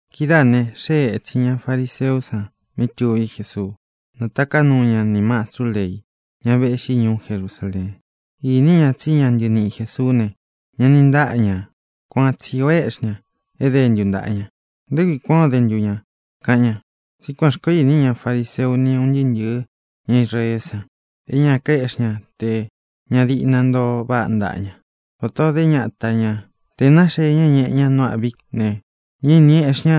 Kidáā ne, xée ētsin ña fariseú san mí tuví Jesuu. Nātaká nuu ña nī mastrú lei, ña véꞌxi ñuú Jerusaleen. Ini ña tsí ña ntɨniꞌi Jēsuú ne, ña ni ntáꞌa ñā. Kuan tsi ō éꞌxi ña é dentu ntāꞌa ña. —¿Nté kui kuān ó de ntu ña? —kaꞌan ña. (Tsí kuān xkoó ini ña fariseu ni un ntɨɨ́ ntɨ̄ɨ́ ña Israeé san, é ña kaéꞌxi ña tē ña diꞌna ntoo váꞌa ntáꞌa ña, vatā o idé ñata ñā. Tē náxee ña é ñēꞌe ña nu âꞌví ne, ñá īni eꞌxí ña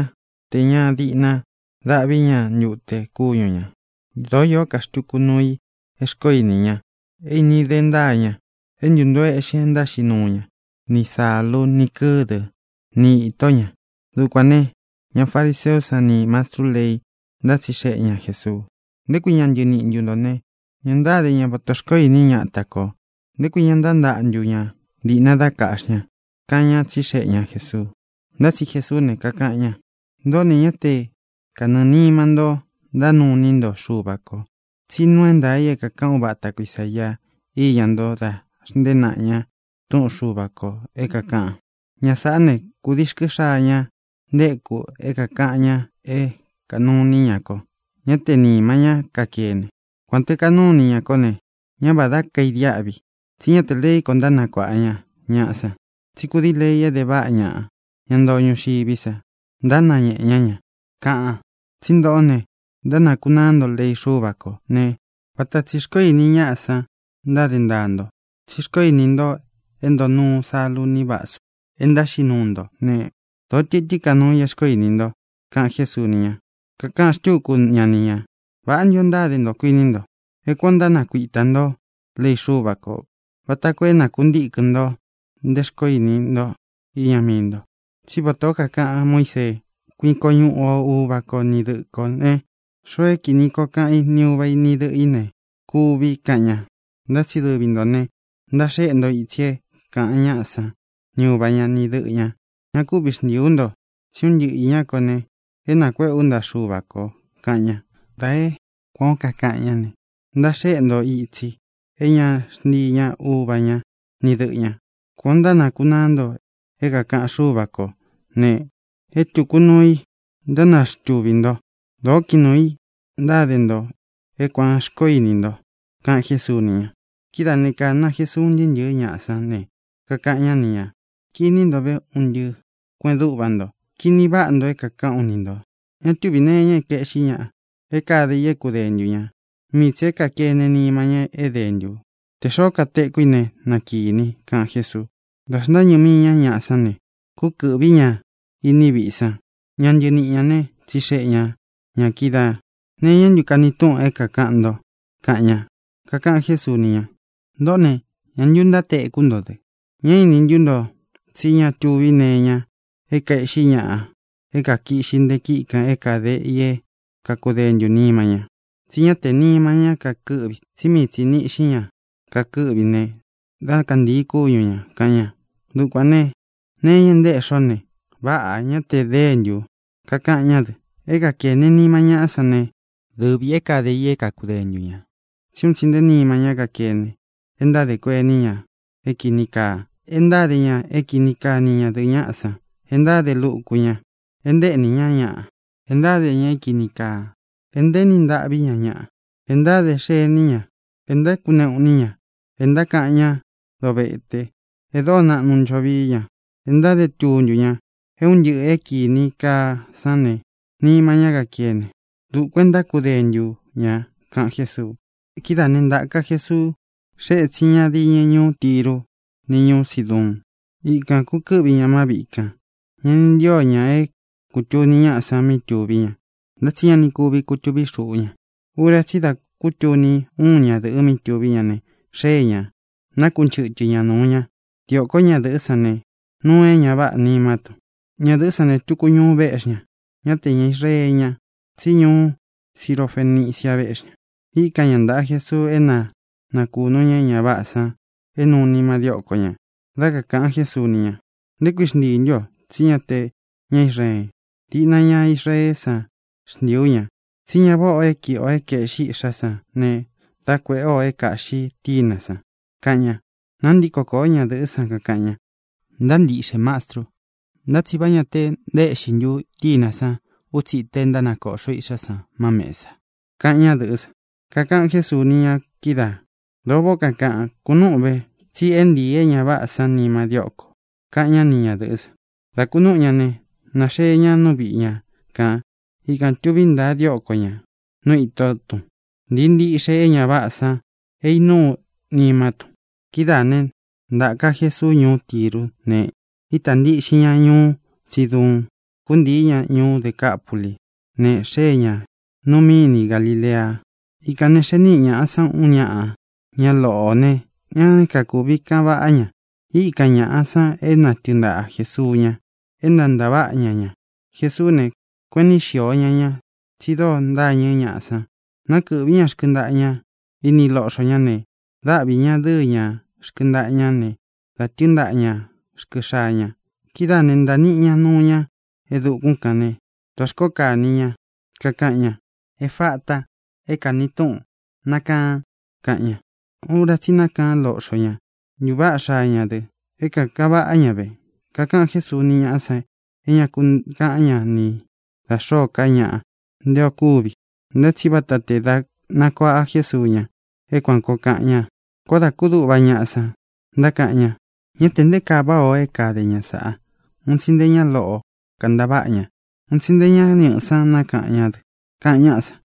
tē ña diꞌna dáꞌvi ña ntute kúñu ñā. Dōó īó ka xtuku nuu i é xkoó ini ña é īni de ntáa ña: é ntūntoo eꞌxin e ntáxiꞌi nuu ña, ni sālú, ni kɨ̄dɨ́, ni ītó ña.) Dukuān ne, ña fariseú san nī mastrú lei ntátsixeꞌe ña Jēsuu: —¿Nté kui ña ntɨniꞌi ntō ne, ña ntáde ña vatā xkoó ini ñáta kō? ¿Nté kui ña ntántaꞌa ntu ña diꞌna dá kaꞌxi ña? —kaꞌan ñá, tsixeꞌe ña Jēsuu. Ntá tsi Jesuú ne, kakaꞌan ña: —Ntōꞌó ne, ñá te kanɨɨ̄ nima ntó ntánuu iní nto Xuva kō. Tsí nuu é ntaā i é kākaꞌan úvata ko Isāia íña nto da xntée naꞌa ña túꞌun Xuva kō é kākaꞌan: Ña sāꞌá ne, kūdii rkɨ́ xaa ña ntéku é kākaꞌan ña é kānuu iní ña ko; ñá tē nima ñá kakene. Kuān te kanúu ini ña kó ne, ñá vādá kaidiáꞌvi i, tsí ña te leí ko é ntánakuāꞌa ña ñaꞌa san, tsí kūdii lei é de váꞌa ñaꞌa, ña ntoo ñuxiví sa, ntánañēꞌe ñá ña, kaꞌan. Tsí ntōꞌó ne, ntánakunaá nto lei Xúva kō ne, vata tsī xkoó ini ñáꞌa san ntáde ntaa nto. Tsi xkoó ini nto é ntōo nuu salu ni vásu é ntáxiꞌi nuu nto ne, dōó tɨtɨ́n ka nuu i é xkoó ini nto —kaꞌan Jésuu ni ña. Kakaꞌan xtúku ña ni ñā: —¿Vāꞌá ntu ō ntáde nto, kuiní nto, é kuān o ntánakuitā ntó lei Xúva kō vata koo é nakuntīkɨn nto nte xkoó ini nto iña mii nto? Tsí vatā ó kakaꞌan Muísee: “Kuiko ñuꞌu o uva ko ni dɨꞌɨ kō”, ne, “Xoo é kīni koo kaꞌan í ni uva i, ni dɨꞌɨ ī ne, kuvi”, kaꞌan ña. Ntá tsi dɨvi ntō ne, ntaxéꞌe nto itsi é kāꞌan ñáꞌa san ni uva ña, ni dɨꞌɨ ñā: “Ña kúvi xntīi ú nto, tsí un ntɨꞌɨ īñá ko ne, é nākuéꞌē ú ntaꞌa Xuva kō”, kaꞌan ña. Da é kuān ó kakaꞌan ñá ne, ntaxéꞌe nto itsi é ña xntii ña uva ña ni dɨꞌɨ ñā. Kuān ó ntánakunaá nto é kākaꞌan Xúva kō ne, é tūku nuu i ntánaxtuvī nto. Dōó kiꞌin nuū i ntáde nto é kuān xkoó ini nto —kaꞌan Jésuu ni ña. Kidáā né, kāna Jesuu un ntɨɨ́ ntɨ̄ɨ́ ñaꞌa sán ne, kakaꞌan ñá ni ñā: —Kini nto ve, un ntɨꞌɨ kueꞌen dúꞌva nto. Kini váꞌa nto é kākaꞌán u ni ntō: Ña túvī nee iña é kaēꞌxí ñaꞌa é kade i é kudentu ñā. Mii tsī é kākene nima ñá é dentū. Tē xoó katekú i ne, na kīni —kaꞌan Jésuu. Dā xntáñɨ mii ña ñaꞌá san ne, kúkɨ̄ꞌví ña iní viꞌi san. Ña ntɨniꞌi ñā né, tsixeꞌe ña ñā kídaā: —¿Nee iñá ntu kani túꞌun é kākaꞌan nto? —kaꞌan ña. Kakaꞌan Jésuu ni ña: —Ntōꞌó ne, ¿ñā ntu ntátekú nto dɨ? ¿Ñá ini ntú nto tsí ña tuví nee iña é kaēꞌxí ñaꞌa é kakiꞌxi nte kiꞌi kan é kade i é kakudentū nima ña? Tsí ña te nima ñá kakɨ́ꞌvi, tsí mii tsi īni iꞌxí ña kakɨ́ꞌvi ne, dá kantīi kúñu ñā —kaꞌan ña. Dukuān ne, nee iña é ntaéꞌxi ó ne, váꞌā; ña te déntū. Kakaꞌan ñá dɨ: —É kakēne nima ñáꞌa sán ne, dɨvī é kade i é kakudentu ñā. Tsí un tsi nté nima ñá kakene e ntádē kuení ña é kīni kaa, e ntáde ña é kini kaa ni ñadɨ̄ꞌɨ ñáꞌa san, e ntáde luku ña, e ntaéꞌní ña ñaꞌa, e ntáde ña é kīni kaa, e ntaéni ntâꞌví ña ñaꞌa, e ntáde xení ña, e ntákuneꞌu iní ña, e ntákaꞌan ñá dovete, e dóo naꞌnu ncho vií ña, e ntáde tuntu ña. É un ntɨꞌɨ̄ é kīni kaa sán ne, nima ñá kakene. Dukuān é ntákudentu ñā —kaꞌan Jésuu. Kidáā né, ntāka Jesuu, xée ētsin ña diñɨ ñuú Tiru ni ñūú Siduun. Ikan kūkɨ́ꞌvi ña má viꞌi kān. Ña ni ntío ñā é kūtuni ñáꞌa san mí tuví ña. Ntá tsi ña ni kúvi kutūvi xuꞌú ña. Ura tsí i dá kutuni úun ñadɨ̄ꞌɨ mí tuví ña ne, xée ñā, nakunchɨ́tɨ ña nūu ña. Diōkó ñadɨ̄ꞌɨ́ san ne, nuu é ña váꞌā nimá tun. Ñadɨ̄ꞌɨ́ san ne, tuku ñuu véꞌxi ña. Ñá te ña Israee ña, tsí ñuú Sirofenicia véꞌxi ña. Íkan ña ntāꞌa Jesuu é na nakūnu ña é ña váꞌā san é nuu nima dióko ñā. Dá kakāꞌan Jésuu ni ña: —¿Nté kui xntii ntū ú o? Tsí ña te ña Israeen. Diꞌna ña Israeé san xntiī ú ña. Tsí ñá vāꞌá ō é kiꞌi ō é kaēꞌxi iꞌxá san ne, dá kuēꞌé ō é kāꞌxi tínā san —kaꞌan ña. Nāntíko kōó ñadɨ̄ꞌɨ́ san, kakaꞌan ña: —Ntáa nchiꞌxe, Mastru. ¿Ntá tsi vá ñā che ntaéꞌxi ntu chínā sán utsi ita é ntánakōꞌxo iꞌxá san má mēsa? —kaꞌan ñádɨ̄ꞌɨ́ san. Kakaꞌan Jésuu ni ña kídaā: —Dōo váꞌā ó kakaꞌan. Kunúꞌun ve, tsi é ntīi é ña váꞌā san nima dióko ō —kaꞌan ñá ni ñadɨ̄ꞌɨ́ san. Dá kūnúꞌu ña ne, nāxee ña nú viꞌi ña kān. Ikān tuví ntaa dióko ñā nú ītó tun. Ntīi ntiꞌxe é ña váꞌā san é īnúu nimá tun. Kidáā né, ntāka Jesuu ñuú Tirú ne, ítā ntiꞌxin ña ñuú Siduun. Kūntii ña ñuú Decapulí, ne, xée ñā nu míni Galilea. Ikān ne, xee níꞌi ñaꞌa san uun ñáꞌa, ña loꞌō ne, ñá kakūvi kaꞌan vaꞌá ña. Íkan ñāꞌa san é na tɨɨn ntaꞌa Jēsuu ña é na ntāváꞌa ña ña. Jesuú ne, kueꞌen niꞌi xío ña ña, tsi dóo ntâñɨ́ ñaꞌa san. Nákɨꞌvī ñá rkɨntaꞌa ña ini loꞌxo ña ne, dáꞌvi ñā dɨ́ɨ ña rkɨntaꞌa ña ne, da tɨ́ɨn ntaꞌa ñā rkɨ xaa ña. Kidáā né, ntāa niꞌi ña nuu ña e dukún kān né, dā xkóo kani ña, kakaꞌan ña: —¡Efata! (é kāni túꞌun: ¡Nakaan!) —kaꞌan ña. Ura tsí i nákaan loꞌxo ña. Ntūváꞌa xaa ña dɨ. É kākaꞌan vaꞌá ña ve. Kakaꞌan Jésuu ni ñáꞌa san é ñā ku kaꞌán ña ni da xōó ka ñaꞌa nte o kúvi. Ntá tsi vata tē da nakuaꞌa Jésuu ña é kuān koo kaꞌan ña. Koó dā kúduꞌva ñaꞌa san, ntákaꞌan ña: —¡Ñá tē nté kaa váꞌā o é kade ña sāꞌa! Un tsi nté ña loꞌo kāntaváꞌa ña. Un tsi nté ña ñɨꞌɨ̄ sán nákaꞌan ñá dɨ —kaꞌan ñáꞌa san.